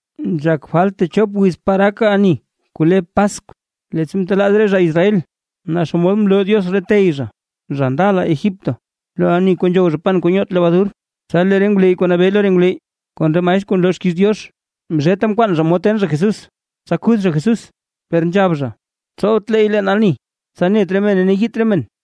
Nzhak falt techop wiz par gak ani kuu le Paskw, leettsa ntelaaz re zha Israel, naa xomod mloo Diox re tey zha, zha ndala Egipto, lo ani kuu nzhow zha pan kuu nyoot lebadur. Tsa lee re ngwleyy kuu nabee lo re ngwleyy kon re maestr kuu nloo xkiiz Diox, zheta mkwaan zha mod ten zha Jesús, tsa kuth zha Jesús. Per nzhab zha: ―Tsowt leey leen ani, tsa net re mene ne yiit re men.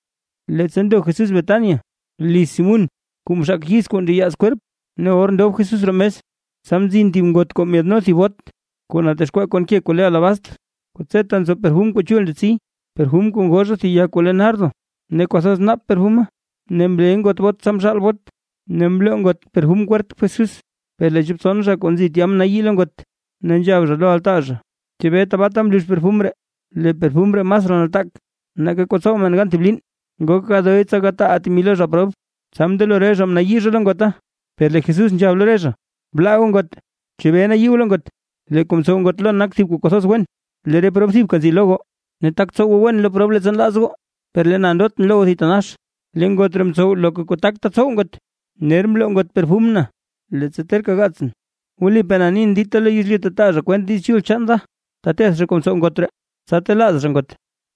Leettsa ndo Jesús Betania, liz Simún kuu mzhaak yiz kuu nteyaaz kwerp, ne or ndob Jesús roo mes. Tsa mzin thib ngot kuu myaadno thib bot kuu natexkwaa kon ke kuu le alabastr, kuu tseta nzo perfum kuu chul ndetsi, perfum kuu ngoo zha thib ya kuu le nardo, ne kwathoz naap perfuma, ne mle ngot bot tsa mzhaal bot, ne mloo ngot perfum kwerp Jesús. Per lee chop tson re zha kuu nzi tya mnayii lo ngot, ne nzhab zha lo altaa zha: ―¿Chebee tabaata mlux perfum ree? Lee perfum ree masraa nataak nake kuu tsow men gan thib liin, ngok gadoy tsa gataaʼaa temi lo re zha prob. Tsa mndelo re zha mnayii zha lo ngota. Per lee Jesús nzhab lo re zhaʼa: ―Blaa goo ngot; ¿chebee nayii goo lo ngot? Lee kuu mtsow ngot lon nak thib kuu kwathoz wen. Lee re prob thibka nzi lo goo, ne tak tsow goo wen lo prob leettsa nlaaz goo, per lee na ndotʼn lo goo thitanax. Lee ngot ree mtsow loka kuu takta tsow ngot, ner mloo ngot perfum na, leettsa terka gaatsʼn. Wlipaa na nin, dita lo yezlyu ta taa zha kwent Diiz Chul chaan da, teteth zha kuu mtsow ngot ree, tsa telaaz zha ngot.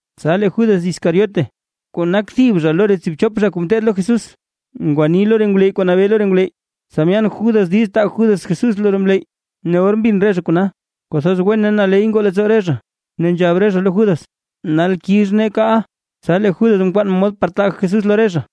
Tsa lee Judas Iscariote kuu nak thib zha lo re tsiibchop zha kuu ngeteed lo Jesús, ngwanii lo re ngwleyy kuu nabee lo re ngwleyy, tsa myaan Judas diiz taa Judas Jesús lo re ngwleyy. Or mbin re zha kona, kwathoz wen ne naley ngoo leettsoo re zha. Ne nzhab re zha lo Judas: ―Nal kix nee kaaʼa. Tsa lee Judas mkwaan mod par taa Jesús lo re zha.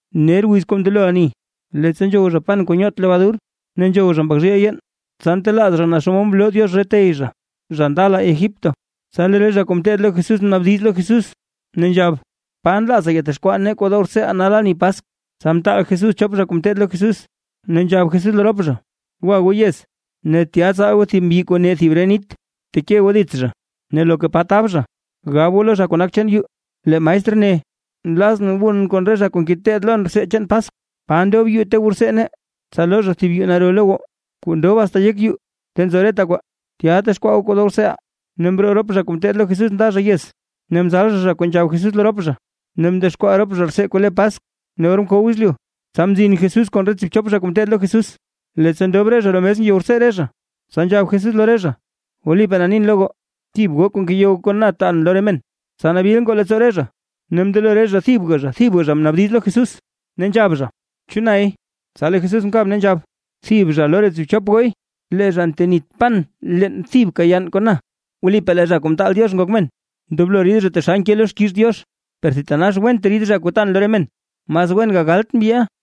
Ner wiz kuu ndelo ani, leettsa nzhow zha pan kuu nyoot lebadur, ne nzhow zha mbak zhiil yeen, tsa ntelaaz zha naa xomod mloo Diox re tey zha, zha ndala Egipto. Tsa lee re zha kuu ngeteed lo Jesús mnaabdiz lo Jesús ne nzhab: ―¿Pa nlaaza yatexkwaa nee kuu dow rtseeʼaa nal ani Paskw? Tsa mtaal Jesús chop zha kuu ngeteed lo Jesús, ne nzhab Jesús lo rop zha: ―Gwa goo yez, ne tya tsaal goo thib mbyi kuu ne thib ree nit, bteke goo dits zha, ne loka pa tab zha, gab goo lo zha kuu nak chaan yuu: “Lee maestr ne, nlazʼn wun kon re zha kuu ngeteed lon rtsee chaan Paskw. ¿Pa ndob yuu kuu ta wu rtsee nee?” Tsa loo zha thib yuu naro lo goo, kuu ndob asta yek yuu ta nzo reta kwaa, tya texkwaa goo kuu dow rtseeʼaa. Ne mroo rop zha kuu ngeteed lo Jesús nda zha yez, ne mzal zha zha kuu nzhab Jesús lo rop zha, ne mdexkwaa rop zha rtsee kuu le Paskw. Ne or mkow yezlyu, tsa mzin Jesús kon re tsiibchop zha kuu ngeteed lo Jesús. Leettsa ndob re zha roo mes ngeyow rtsee re zha, tsa nzhab Jesús lo re zha: ―Wlipaa na nin lo re goo, thib goo kuu ngeyow kon na taan lo re men. Tsa nabil ngoo leettsoo re zha, ne mndelo re zha thibga thibga zha mnaabdiz lo Jesús, ne nzhab zha: ―¿Chu nay? Tsa lee Jesús mkab ne nzhab: ―Thib zha lo re thib tsiibchop gooy, lee zha ntenit pan leen thibka yann kon na. Wlipaa lee Zha Kuu Mtaal Diox Ngok Men, ndoblo rid zha taxal nke lo xkiiz Diox. Per thitanax went rid zha kuu tan lo re men, mas wen gagalt mbyiʼa.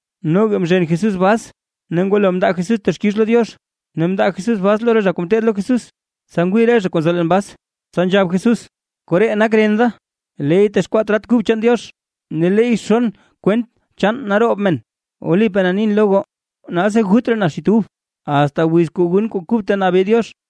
Noga mzhen Jesús bas ne ngwalo mndaa Jesús texkix lo Diox, ne mndaa Jesús bas lo re zha kuu ngeteed lo Jesús, tsa ngwii re zha kuu nzo leen bas. Tsa nzhab Jesús: ―Koree nak ren da, leey texkwaa trat kub chaan Diox, ne leey xon kwent chaan naroob men. Wlipaa na nin lo goo, nalsi gut raa na xit ub, asta wiz kuu gun kuu kub ta nabee Diox.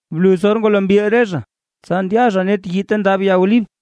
Bluz or ngwalo mbil re zha, tsa ndya zha net yii ta ndab ya olib.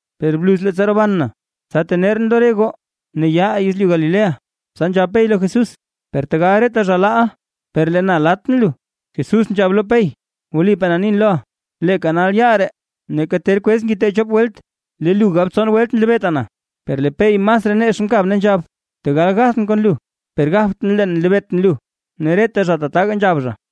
Per bluz leettsa roban na, tsa tenerʼn lo re goo ne ya reʼaa yezlyu Galilea. Tsa nzhab Pey lo Jesús: ―¡Per tegal reta zha laaʼa, per lee na latʼn lu! Jesús nzhab lo Pey: ―Wlipaa na nin loʼa, leeka nal yaal ree, neeka ter kwez ngite chop welt, lee lu gab tson welt nlebeeta na. Per lee Pey masraa nex mkab ne nzhab: ―Tegal gathʼn kon lu, per gabtʼn: “Leen nlebeetʼn lu”. Ne reta zha tataga nzhab zha.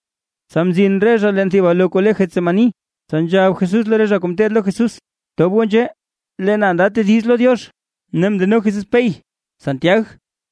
Tsa mzin re zha leen thib alo kuu le Getsemaní, tsa nzhab Jesús lo re zha kuu ngeteed lo Jesús: ―Tob goo nzhee, lee na nda tediz lo Diox. Ne mndeno Jesús Pey, Santiag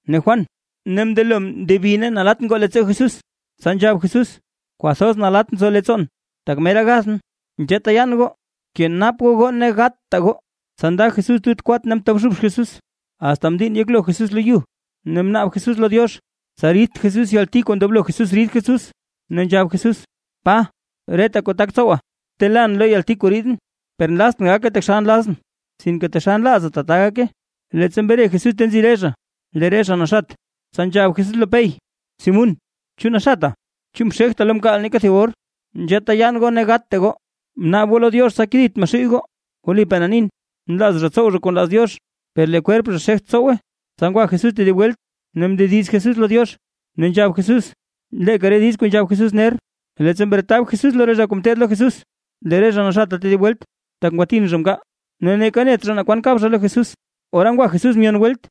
ne Juan ne mndelo mndebi ne nalatt ngoo leettsoo Jesús. Tsa nzhab Jesús: ―Kwathoz nalatt nzo leettsoon, tak mera gathʼn, nzheeta yaan goo, kenap goo goo ne gatta goo. Tsa nda Jesús tut kwat ne mtobxub Jesús asta mdiinn yeklo Jesús lo yu. Ne mnaab Jesús lo Diox, tsa ridt Jesús yalti kuu ndoblo Jesús rid Jesús. Ne nzhab Jesús: ―¡Pa! Reta kuu tak tsowa. Btelaan lo yalti kuu riidʼn, per nlaztʼn gake taxal nlazʼn, sinke taxal nlaaza tata gake. Leettsa mre Jesús ta nzi re zha, lee re zha naxat, tsa nzhab Jesús lo Pey: ―Simún, ¿chu naxata? ¿Chu mxegta lo mkaal neeka thib or? Nzheeta yaan goo ne gatta goo, bnaab goo lo Diox, tsa kedit Maxuuy goo. Wlipaa na nin, nlaaz zha tsow zha kuu nlaaz Diox, per lee kwerp zha xegt tsowe. Tsa ngwa Jesús tedib welt ne mndediz Jesús lo Diox, ne nzhab Jesús leeka re diiz kuu nzhab Jesús ner. Leettsa mretab Jesús lo re zha kuu ngeteed lo Jesús ne lee re zha naxata tedib welt, tak ngwatin zha mkaal. Ne neeka net zha naa kwan kab zha lo Jesús. Ora ngwa Jesús myon welt,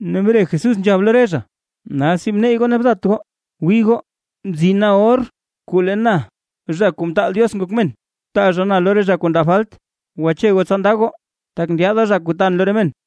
ne mre Jesús nzhab lo re zha: ―¡Nalsi, bneyy goo ne bdat goo! Wii goo, mzina or kuu lee na Zha Kuu Mtaal Diox Ngok Men, taa zha na lo re zha kuu ndab falt. Gwache goo tsa ndaa goo, tak ndyaada zha kuu taan lo re men.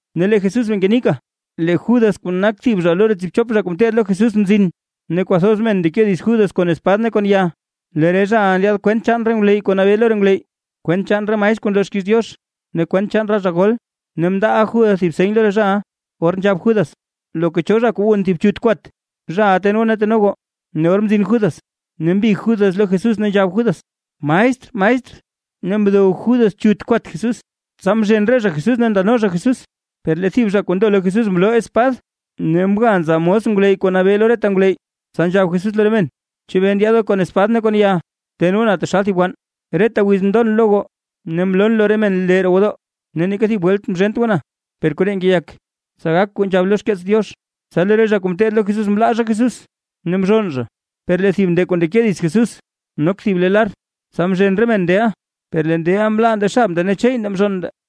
Ne lee Jesús bee ngenika, lee Judas kuu nak thib zha lo re tsiibchop zha kuu mteed lo Jesús mzin. Ne kwathoz men ndeke dits Judas kon espad ne kon ya, lee re zhaʼa ndyaad kwent chaan re ngwleyy kuu nabee lo re ngwleyy, kwent chaan re maestr kuu nloo xkiiz Diox ne kwent chaan re zha gol. Ne mndaaʼa Judas thib seny lo re zhaʼa: Or nzhab Judas: ―Loka cho zha kuu wun thib chut kwat, zhaʼa ten goo ne teno goo. Ne or mzin Judas, ne mbig Judas lo Jesús ne nzhab Judas: ―¡Maestr! ¡Maestr! Ne mdow Judas chut kwat Jesús. Tsa mzhen re zha Jesús ne ndano zha Jesús. Per lee thib zha kuu ndo lo Jesús mloo espad ne mga nza mos ngwleyy kuu nabee lo reta ngwleyy. Tsa nzhab Jesús lo re men: ―¿Chebee ndyaad goo kon espad ne kon ya, ten goo na taxal thib wann? Reta wiz mndon lo goo, ne mloon lo re men lee roo gwodoo, ne neeka thib welt mzhent goo na. Per koree ngeyak, tsa gak kuu nzhab lo xkeets Diox. Tsa lee re zha kuu mteed lo Jesús mlaa zha Jesús ne mzhonn zha. Per lee thib nde kuu ndeke dits Jesús, nok thib le lar, tsa mzhen re men ndeʼa. Per lee ndeʼa mlaa nde xab nde ne cheey nde mzhonn nde.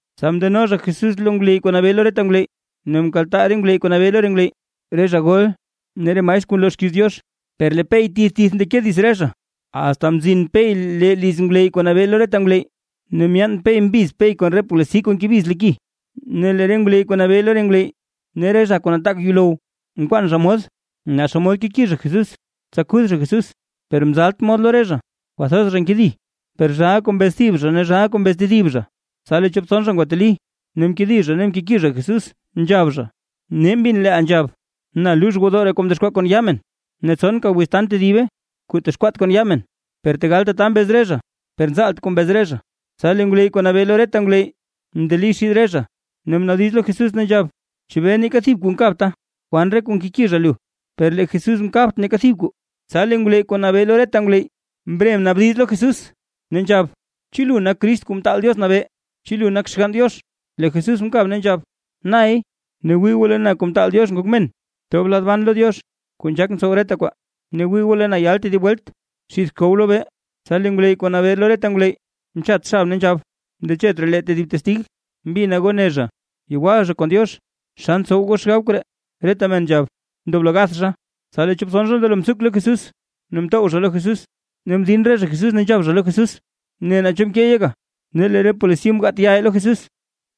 Tsa mndeno zha Jesús lo ngwleyy kuu nabee lo reta ngwleyy, ne mkaltaa re ngwleyy kuu nabee lo re ngwleyy, re zha gol ne re maestr kuu nloo xkiiz Diox. Per lee Pey tith tith mndeke dits re zha, asta mzin Pey lee liz ngwleyy kuu nabee lo reta ngwleyy, ne myaan Pey mbiz Pey kon re polisi kuu ngebiz lo ki. Ne lee re ngwleyy kuu nabee lo re ngwleyy ne re zha kuu nataak yuulow, mkwaan zha mod, naa xomod keki zha Jesús, tsa kuth zha Jesús, per mzalt mod lo re zha. Kwathoz zha nkedi, per zhaa kuu mbez thib zha ne zhaa kuu mbez tedib zha. Tsa lee chop tson zha ngwateli ne mkedi zha ne mkeki zha Jesús nzhab zha: ―Nee mbin leeʼa nzhab: “Na luux gwodoo ree kuu mdexkwaa kon yaa men, ne tsonka wiz tan tedibe, kuu texkwaat kon yaa men”. Per tegal tata mbez re zha, per nzaalt kuu mbez re zha. Tsa lee ngwleyy kuu nabee lo reta ngwleyy mndeli xid re zha, ne mnaabdiz lo Jesús, ne nzhab: ―¿Chebee neeka thib kuu nkabta? ¿Kwan re kuu nkeki zha lu? Per lee Jesús mkabt neeka thib kwaa, tsa lee ngwleyy kuu nabee lo reta ngwleyy mre mnaabdiz lo Jesús, ne nzhab: ―¿Chu lu nak Crist kuu Mtaal Diox nabee? ¿Chu lu nak Xgann Diox? Lee Jesús mkab ne nzhab: ―Nay. Ne wii goo lee na Zha Kuu Mtaal Diox Ngok Men, tob lad ban lo Diox kuu nzhak ntsow reta kwaa. Ne wii goo lee na yal tedib welt xidth xkow lobee. Tsa lee ngwleyy kuu nabee lo reta ngwleyy mchat xab ne nzhab: ―¡Ndechet raa lee tedib testig! ¡Mbina goo ne zha, yewal zha kon Diox! ¿Xa ntsow goo xgab koree? Reta men nzhab: ―¡Ndoblo gath zha! Tsa lee chop tson zha mndelo mtsuk lo Jesús, ne mtow zha lo Jesús, ne mdin re zha Jesús ne nzhab zha lo Jesús: ―¡Ne, naa cho mkeey yeka! Ne lee re polisi mgaat yaa lo Jesús.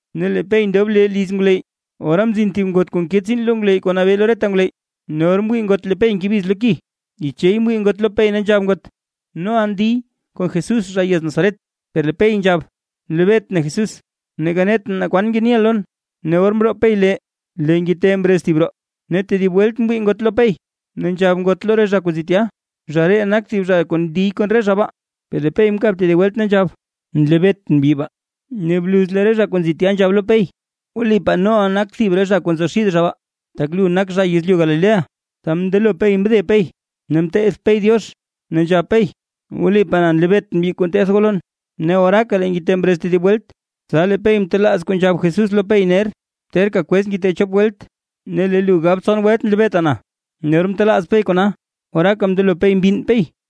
Ne lee Pey ndob lee liz ngwleyy. Ora mzin thib ngot kuu nke tsiin lo ngwleyy kuu nabee lo reta ngwleyy. Ne or mwii ngot lee Pey ngebiz lo ki, yichey mwii ngot lo Pey ne nzhab ngot: ―Noʼa ndiy kon Jesús, zha yez Nazaret. Per lee Pey nzhab: ―Nlebeetʼn Jesús, neeka netʼn naa kwan ngeniʼa lon. Ne or mroo Pey lee lee ngite mrez thib roo. Ne tedib welt mwii ngot lo Pey, ne nzhab ngot lo re zha kuu nzi tya: ―Zha ree nak thib zha kuu ndiy kon re zha baa. Per lee Pey mkab tedib welt ne nzhab: ―Nlebeetʼn mbyi baa. Ne bluz lee re zha kuu nzi tya nzhab lo Pey: ―Wlipaa noʼa nak thib re zha kuu nzo xid re zha baa, tak lu nak zha yezlyu Galilea. Tsa mndelo Pey mde Pey, ne mteth Pey Diox, ne nzhab Pey: ―¡Wlipaa naa nlebeetʼn mbyi kuu nteth goo lon! Ne oraaka lee ngite mrez tedib welt, tsa lee Pey mtelaaz kuu nzhab Jesús lo Pey ner: “Terka kwez ngite chop welt ne lee lu gab tson welt nlebeeta na”. Ne or mtelaaz Pey kona, oraaka mndelo Pey mbinn Pey.